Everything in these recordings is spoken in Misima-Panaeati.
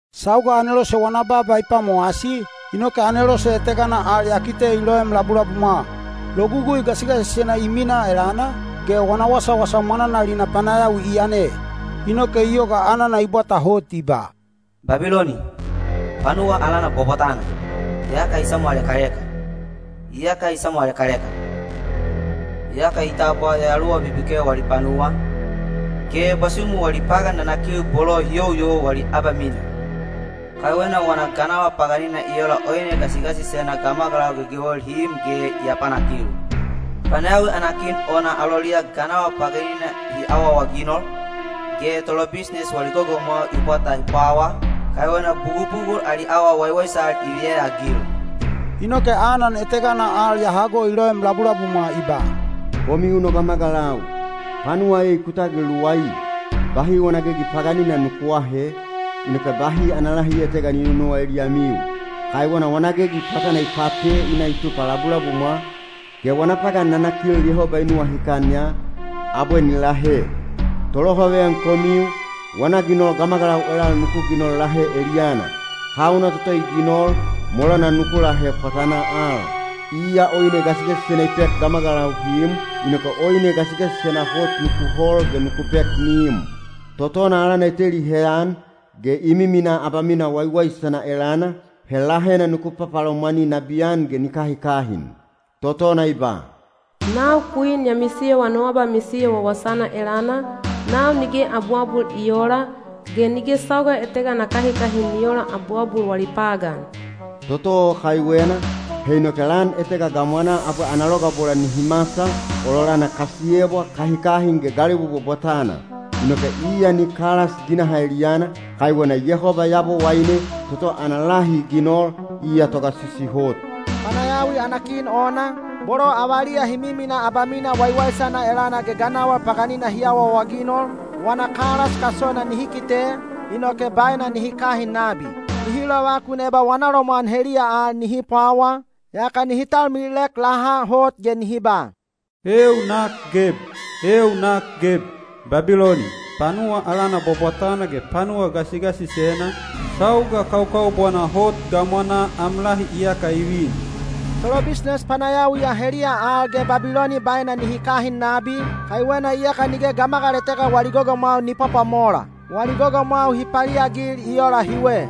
Sauga anelose wana baaba i pwamowasi, inoke anelose etegana al ya kite i loem labulabumwa. Logugui gasigasisena i minaa elana, ge wana wasawasa mwananalina panayawi i yane. Inoke i yoga anana i bwata hot i ba, “Babiloni, panuwa alana bwabwatana, iyaka i samwalekaleka, iyaka i samwalekaleka! Iyaka i tabwa yayaluwa bibikel wali panuwa, ge bwasumu wali pagan nanakil bolo hi youyou wali abamina. Kaiwena wana ganawal paganina i ola oine gasigasisena gamagalau gegewel hi im ge i apanakil. Panayawi ana kin ona aloliya ganawal paganina hi awaawaginol, ge tolobisnes wali gogomwau i bwata hi pwawa, kaiwena bugubugul ali awa waiwaisal i viyeyaagil.” Inoke anan etegana al ya hago i loem labulabumwa i ba: “Komiu no gamagalau, panuwa ei ku tagil luwai! Bahi wana gegi paganina nuku aahe, inoke bahi ana lahi etega ni nonowa eliyamiu. Kaiwena wana gegi pwatana i pate i na i tupa labulabumwa, ge wana pagan nanakil Yehoba i nuwahikan ya, abwe ni lahe. Tolohaveyan komiu, wana ginol gamagalau elal nuku ginol lahe eliyana. Hauna toto i ginol, molana nuku lahe pwatanaa al. Iya oine gasigasisena i pek gamagalau hi im, inoke oine gasigasisena hot nuku hol ge nuku pek ni im. Totona alana i teli heyan, ge i miminaa abamina waiwaisana elana, he lahena nuku papalomwani nabiyan ge ni kahikahin. Totona i ba, ‘Nau kwin ya misiyowa no abamisiyo wawasana elana, nau nige abuabul i oola, ge nige sauga etega na kahikahin ni oola abuabul wali pagan.’ Toto o kaiwena, he inoke lan etega gamwanaa abwe ana logabola nihi masal, ololana kasiyebwa, kahikahin ge galebu bwabwatana. Inoke iya ni kalas ginaha eliyana, kaiwena Yehoba Yabowaine, toto ana lahi i ginol, iya Togasisi Hot.” Panayawi ana kin ona, bolo avaliya hi miminaa abamina waiwaisana elana ge ganawal paganina hi awaawaginol, wana kalas kasona nihi kite, inoke baena nihi kahin nabi. Nihi lovakun eba wana lomwan heliya al nihi pwawa, yaka nihi talmililek laha hot ge nihi ba, “Eeu nak geb! Eeu nak geb! Babiloni, panuwa alana bwabwatana ge panuwa gasigasisena, sauga kaukaubwana hot gamwanaa am lahi iyaka i vin.” Tolobisnes panayawiya heliya al ge Babiloni baena nihi kahin nabi, kaiwena iyaka nige gamagal etega wali gogomwau ni pwapwamola. Wali gogomwau hi paliagil i ola hiwe: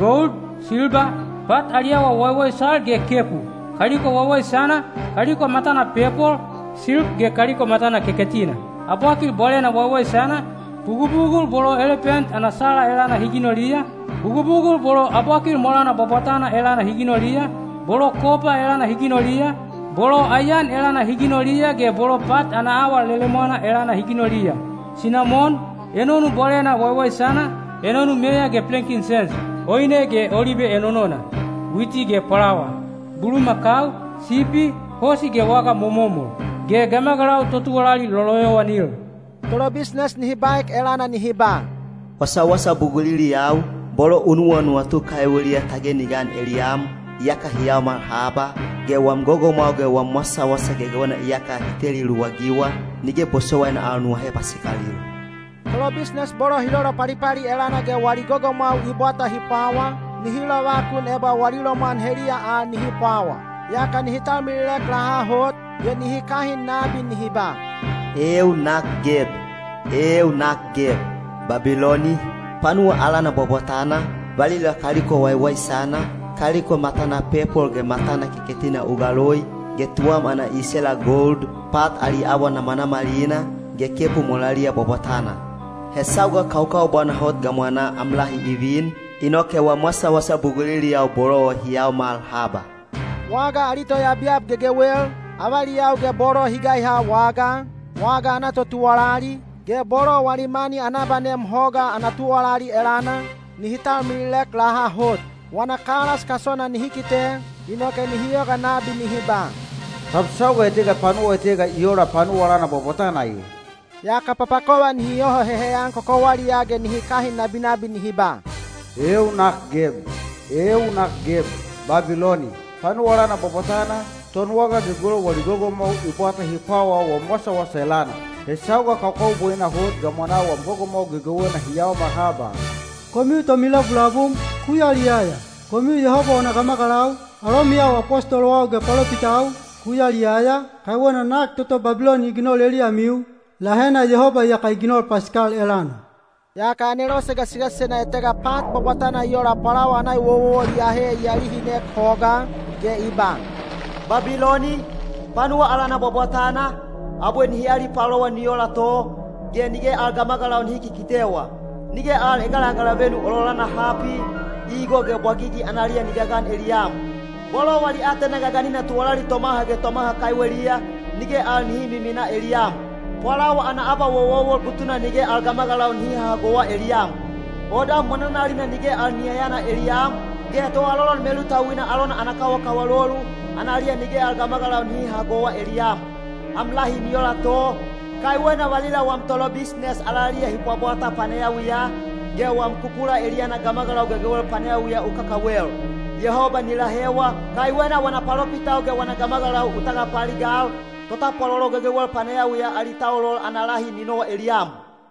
gold, silba, pat ali awa waiwaisal ge kepu; kaliko waiwaisana, kaliko matana pepol, silk ge kaliko matana keketina; abwakil bwalena waiwaisana, bugubugul bolo elepent ana sala elana hi ginoliya, bugubugul bolo abwakil molana bwabwatana elana hi ginoliya, bolo kopa elana hi ginoliya, bolo aiyan elana hi ginoliya ge bolo pat ana awa lelemwana elana hi ginoliya; sinamon, enonu bwalena waiwaisana, enonu meya ge plenkinsens; oine ge olibe enonona; witi ge pwalawa; bulumakau, sipi, hosi ge waga momomol; ge gamagalau totuwalali loloyowanil. Tolobisnes nihi baek elana nihi ba, “Wasawasa buguliliyau, bolo u nuwanuwatu kaiweliya tage ni gan eliyam, iyaka hi yaomal haba, ge wam gogomwau ge wam wasawasa gegewena iyaka hi teli luwagiwa, nige bosowaina al nu ahe pasikalil.” Tolobisnes bolo hi lolopalipali elana ge wali gogomwau i bwata hi pwawa, nihi lovakun eba wana lomwan heliya al nihi pwawa. Yaka nihi talmililek laha hot, ge nihi kahin nabi nihi ba, “Eeu nak geb! Eeu nak geb! Babiloni, panuwa alana bwabwatana, valila kaliko waiwaisana, kaliko matana pepol ge matana keketina u galoi, ge tuwam ana isela gold, pat ali awa namanamalina, ge kepu molaliya bwabwatana. He sauga kaukaubwana hot gamwanaa am lahi i vin, inoke wam wasawasa buguliliyau bolo o hi yaomal haba.” Waga ali toyabyab gegewel, avaliyau ge bolo hi gaiha wagaa, waga ana totuwalali, ge bolo wali mani ana abanem hoga ana tuwalali elana, nihi talmililek laha hot. Wana kalas kasona nihi kite, inoke nihi yoga nabi nihi ba, “Tab sauga etega panuwa etega i ola panuwa alana bwabwatana e?” Yaka papakova nihi yoho heheyan kokowaliyaa ge nihi kahin nabinabi nihi ba, “Eeu nak geb! Eeu nak geb! Babiloni, panuwa alana bwabwatana, tonwaga gegewel wali gogomwau i bwata hi pwawaa wam wasawasa elana. He sauga kaukaubwana hot gamwanaa wam gogomwau gegewena hi yaomal haba!” Komiu tomilabulabum, ku yaliyaya! Komiu Yehoba wana gamagalau, alomiyau apostolowau ge palopitau, ku yaliyaya, kaiwena nak toto Babiloni i ginol eliyamiu, lahena Yehoba iyaka i ginol pasikal elana. Yaka anelose gasigasisena etega pat bwabwatana i ola pwalawa ana ewowowol i ahe i alihinek hogaa, ge i ba: Babiloni, panuwa alana bwabwatana, abwe nihi alipalowa ni ola to, ge nige al gamagalau nihi kikitewa. Nige al egalagalavenu ololana hapi, igo ge bwagigi analiya ni gagan eliyam. Bolo wali aatena gaganina tuwalali tomaha ge tomaha kaiweliya, nige al nihi miminaa eliyam. Pwalawa ana abawowowol butuna nige al gamagalau nihi hahagowa eliyam. Odam mwananalina nige al ni yayana eliyam, ge toalolon melutauina alona ana kawakawalolu, analiya nige al gamagalau nihi hahagowa eliyam. Am lahi ni ola to, kaiwena valila wam tolobisnes alaliya hi pwabwata panayawiya, ge wam kukula eliyana gamagalau gegewel panayawiya u kakawel. Yehoba ni lahewa, kaiwena wana palopitau ge wana gamagalau u tagapaaligal, totapwalolo gegewel panayawiya ali taulol ana lahi ni nowa eliyam.